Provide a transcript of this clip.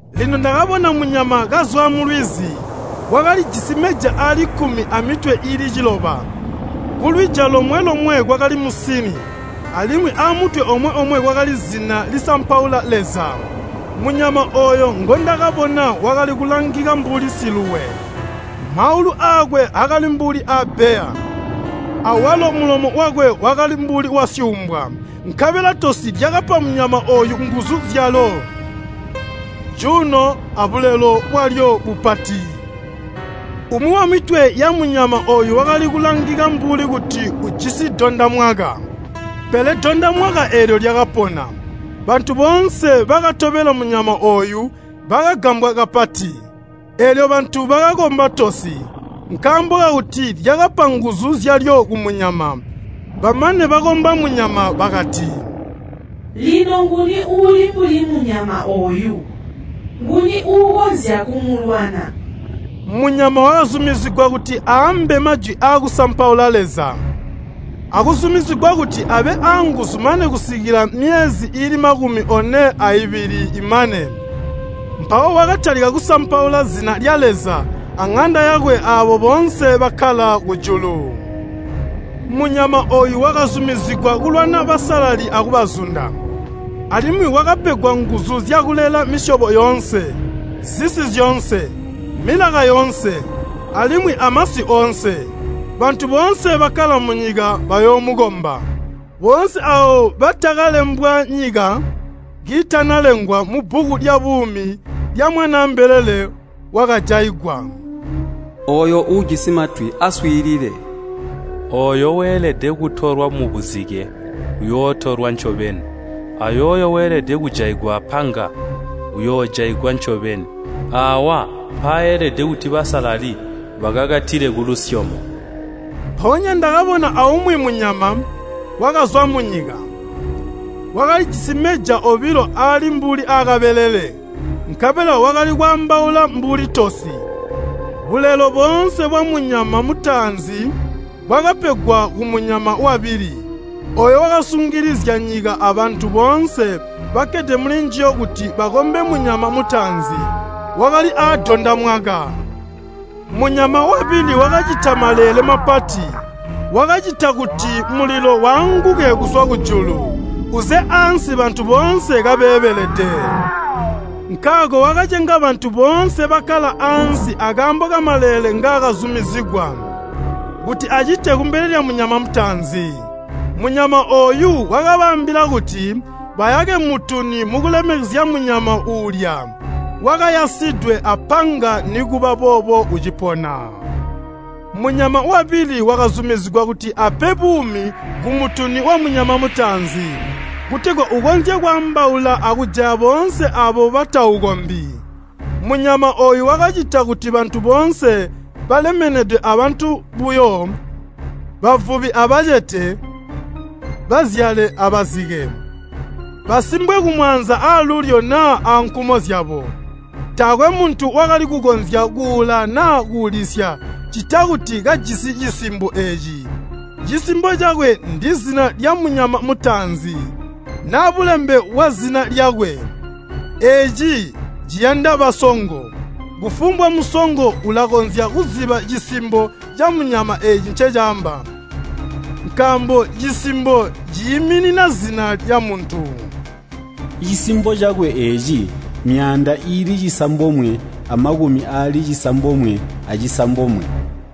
Lino ndakabona munyama kazwa mulwizi. Wakalijisi meja aali kkumi amitwe iili ciloba, kulwija lomwe-lomwe kwakali musini, alimwi amutwe omwe-omwe kwakali zina lisampaula Leza. Munyama ooyo ngondakabona wakali kulangika mbuli siluwe. Maulu aakwe akali mbuli aabbeya, awalo mulomo wakwe wakali mbuli wasyuumbwa. Nkabela tosi lyakapa munyama ooyu nguzu zyalyo, cuuno, abulelo bwalyo bupati. Umwi wamitwe yamunyama ooyu wakali kulangika mbuli kuti ujisi dondamwaka, pele dondamwaka eelyo lyakapona. Bantu boonse ibakatobela munyama ooyu, bakagambwa kapati. Eelyo bantu bakakomba tosi, nkaambo kakuti lyakapa nguzu zyalyo kumunyama. Bamane bakakomba munyama, bakati, “Lino nguni uuli mbuli munyama ooyu? Nguni uukonzya kumulwana?” Munyama wakazumizigwa kuti aambe majwi aakusampaula Leza, akuzumizigwa kuti abe aanguzu mane kusikila myezi iili makumi one aibili imane. Mpawo wakatalika kusampaula zina lya Leza aŋanda yakwe aabo boonse bakkala kujulu. Munyama ooyu wakazumizigwa kulwana basalali akubazunda. Alimwi wakapegwa nguzu zyakulela misyobo yoonse, zisi zyoonse, milaka yoonse, alimwi amasi oonse. Bantu boonse bakkala munyika bayoomukomba, boonse aabo batakalembwa nyika kiitanalengwa mubbuku lyabuumi lya Mwanaa mbelele wakajaigwa. “Ooyo uujisi matwi aswiilile! Ooyo weelede kutolwa mubuzike, uyootolwa ncobeni, ayooyo weelede kujaigwa apanga, uyoojaigwa ncobeni. Aawa mpaelede kuti basalali bakakatile kulusyomo.” Mpoonya ndakabona aumwi munyama, wakazwa munyika. Wakalijisi meja obilo aali mbuli aakabelele, nkabela wakali kwaambaula mbuli tosi. Bulelo boonse bwamunyama mutaanzi bwakapegwa kumunyama wabili. Ooyo wakasungilizya nyika abantu boonse bakkede mulinjiyo kuti bakombe munyama mutaanzi, wakali adondamwaka. Munyama wabili wakacita maleele mapati, wakacita kuti mulilo waanguke kuzwa kujulu, uze ansi bantu boonse kabeebelede. Nkaako wakacenga bantu boonse bakkala ansi akaambo kamaleele ngaakazumizigwa kuti acite kumbele lyamunyama mutaanzi. Munyama ooyu wakabaambila kuti bayake mutuni mukulemekezya munyama uulya wakayasidwe apanga nikuba boobo ucipona. Munyama wabili wakazumizigwa kuti ape buumi kumutuni wamunyama mutaanzi, kutegwa ukonzye kwaambaula akujaya boonse aabo bataukombi. Munyama ooyu wakacita kuti bantu boonse balemenede abantu buyo, bavubi abacete, bazyale abazike, basimbwe kumaanza aalulyo naa ankumo zyabo. Taakwe muntu wakali kukonzya kuula naa kuulisya ccita kuti kajisi cisimbo eeci. Cisimbo cakwe ndizina lyamunyama mutaanzi, naa bulembe bwazina lyakwe. Eeci ciyanda basongo. Kufumbwa musongo ulakonzya kuziba cisimbo camunyama eeci ncecaamba, nkaambo cisimbo ciiminina zina lyamuntu. Cisimbo cakwe eeci myaanda iili cisambomwe amakumi aali cisambomwe acisambomwe.